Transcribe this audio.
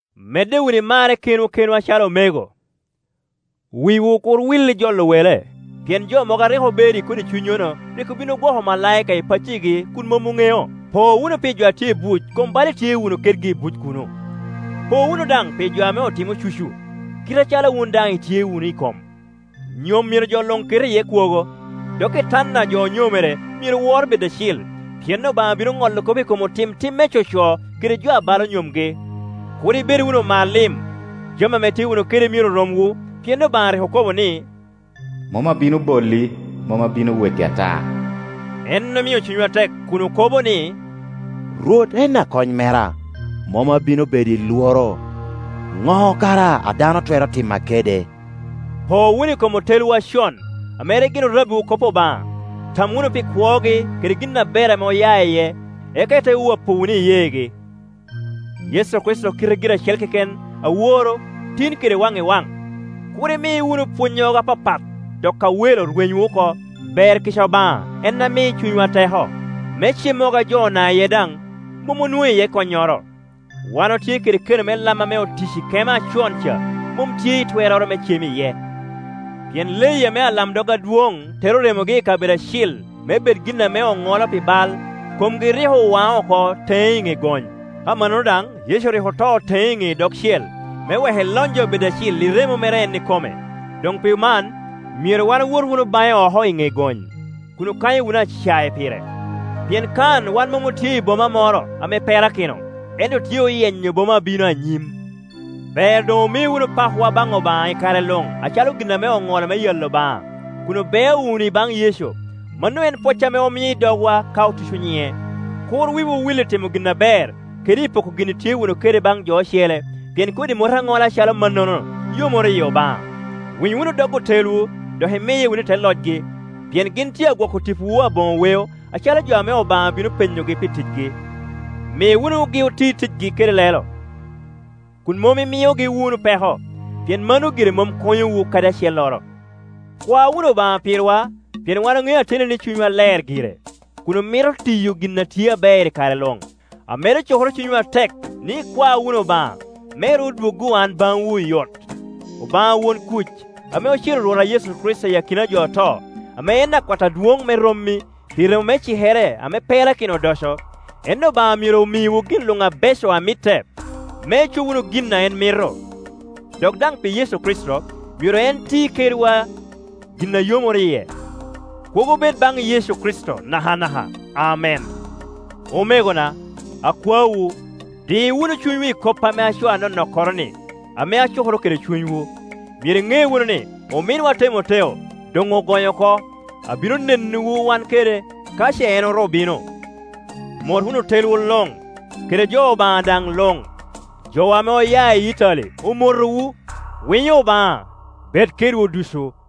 Medde wunu i marre kenwu kenwu acalo omego. Wiwu kur wil i jolo wele, pien jo mogo a rik obedo i kodi cunnyono rik obin ogwoko omalaika i paccigi kun mom oŋeo. Po wunu pi jo a tye i buc kom bala itye wunu kedgi i buc kuno. Po wunu daŋ pi jo ame otimo cucu, kite acalo wun daŋ itye wunu i kom. Nyom myero jo luŋ ket iye kwogo, dok itanda a jo onyomere myero wor bed acil; pien Obaŋa bino ŋolo kop i kom otim tim me coco kede jo abalo nyomgi. Kur i bed wunu omar lim; jami ame itye wunu kede myero romwu, pien Obaŋa rik okobo ni, “Mom abino boli, mom abino weki ata.” En omio cunywa tek, kun okobo ni, “Rwot en akony mera, mom abino bedo i lworo; ŋo kara a dano twero tima kede?” Po wunu i kom otelwu acon, ame rik gin orabbiwu kop Obaŋa. Tam wunu pi kwogi kede gin aber ame oya iye, eka ite wapo wunu iyeegi. Yecu Kricito kite gire acel keken aworo, tin kede waŋ i waŋ. Kur imi wunu pwonnyogo apapat dok awelo rwenywu oko; ber kica Obaŋa en a mi cunywa teko, mom cemmogo ame jo ona iye daŋ mom onwoŋo iye konnyoro. Wan otye kede keno me lam ame otic i kema acon ca mom tye i twerroro me cem iye. Pien leyi ame alamdog adwoŋ tero remogi i kabedo acil me bed gin ame oŋolo pi bal, komgi rik owaŋo oko teŋe i ŋe gony. Amannono daŋ Yecu rik oto teŋe i ŋe idogcel, me wek elony jo bed acil i remo mere en ikome. Doŋ pi man myero wan owot wunu baŋe oko i ŋe gony, kun okanyo wunu acae pire; pien kan wan mom otye i boma moro ame perakino, ento otye oyenyo boma a bino anyim. Ber doŋ omi wunu pakwa baŋ Obaŋa i kare luŋ acalo gin ame oŋolo me yalo Obaŋa, kun obeo wunu i baŋ Yecu; mano en pwoc ame omio i dogwa ka otuco nyiŋe. Kur wiwu wil i timo gin aber kede i poko gin itye wunu kede baŋ jo ocele, pien kodi mot aŋola acalo mannono yomoro yi Obaŋa. Winy wunu dog otelwu, dok imiye wunu i te locgi, pien gin tye a gwoko tipowu aboŋo weo acalo jo ame Obaŋa bino penyogi pi ticgi. Mi wunugi oti ticgi kede lelo, kun mom imiogi wunu peko, pien mano gire mom konyowu kadi acelloro. Kwa wunu Obaŋa pirwa, pien wan oŋeo ateni ni cunywa ler gire, kun omito tiyo gin a tye aber i kare luŋ. Amedo cukoro cunywu atek ni ikwa wunu Obaŋa, me ru dwoggo an baŋwu oyot. Obaŋa won kuc ame ocero Rwotwa Yecu Kricito i akina a jo oto, ame en akwat adwoŋ me rommi, pi remo me cikere ame perakino odoco, en Obaŋa myero omiwu gin luŋ abeco a mitte, me icob wunu gin a en mito; dok daŋ pi Yecu Kricito myero en ti kedwa gin a yomoro yie. Kwogo bed baŋ Yecu Kricito nakanaka. Amen. Omegona, akwaowu, di wunu cunywu i koppa ame acoo anonokkoroni ame acukoro kede cunywu. Myero iŋe wunu ni, ominwa Temoteo doŋ ogonyo oko; abino nenowu wan kede, ka ce en oru bino. Mot wunu otelwu luŋ, kede jo Obaŋa daŋ luŋ. Jowa ame oya i Itali omotowu. Winyo Obaŋa bed kedwu ducu.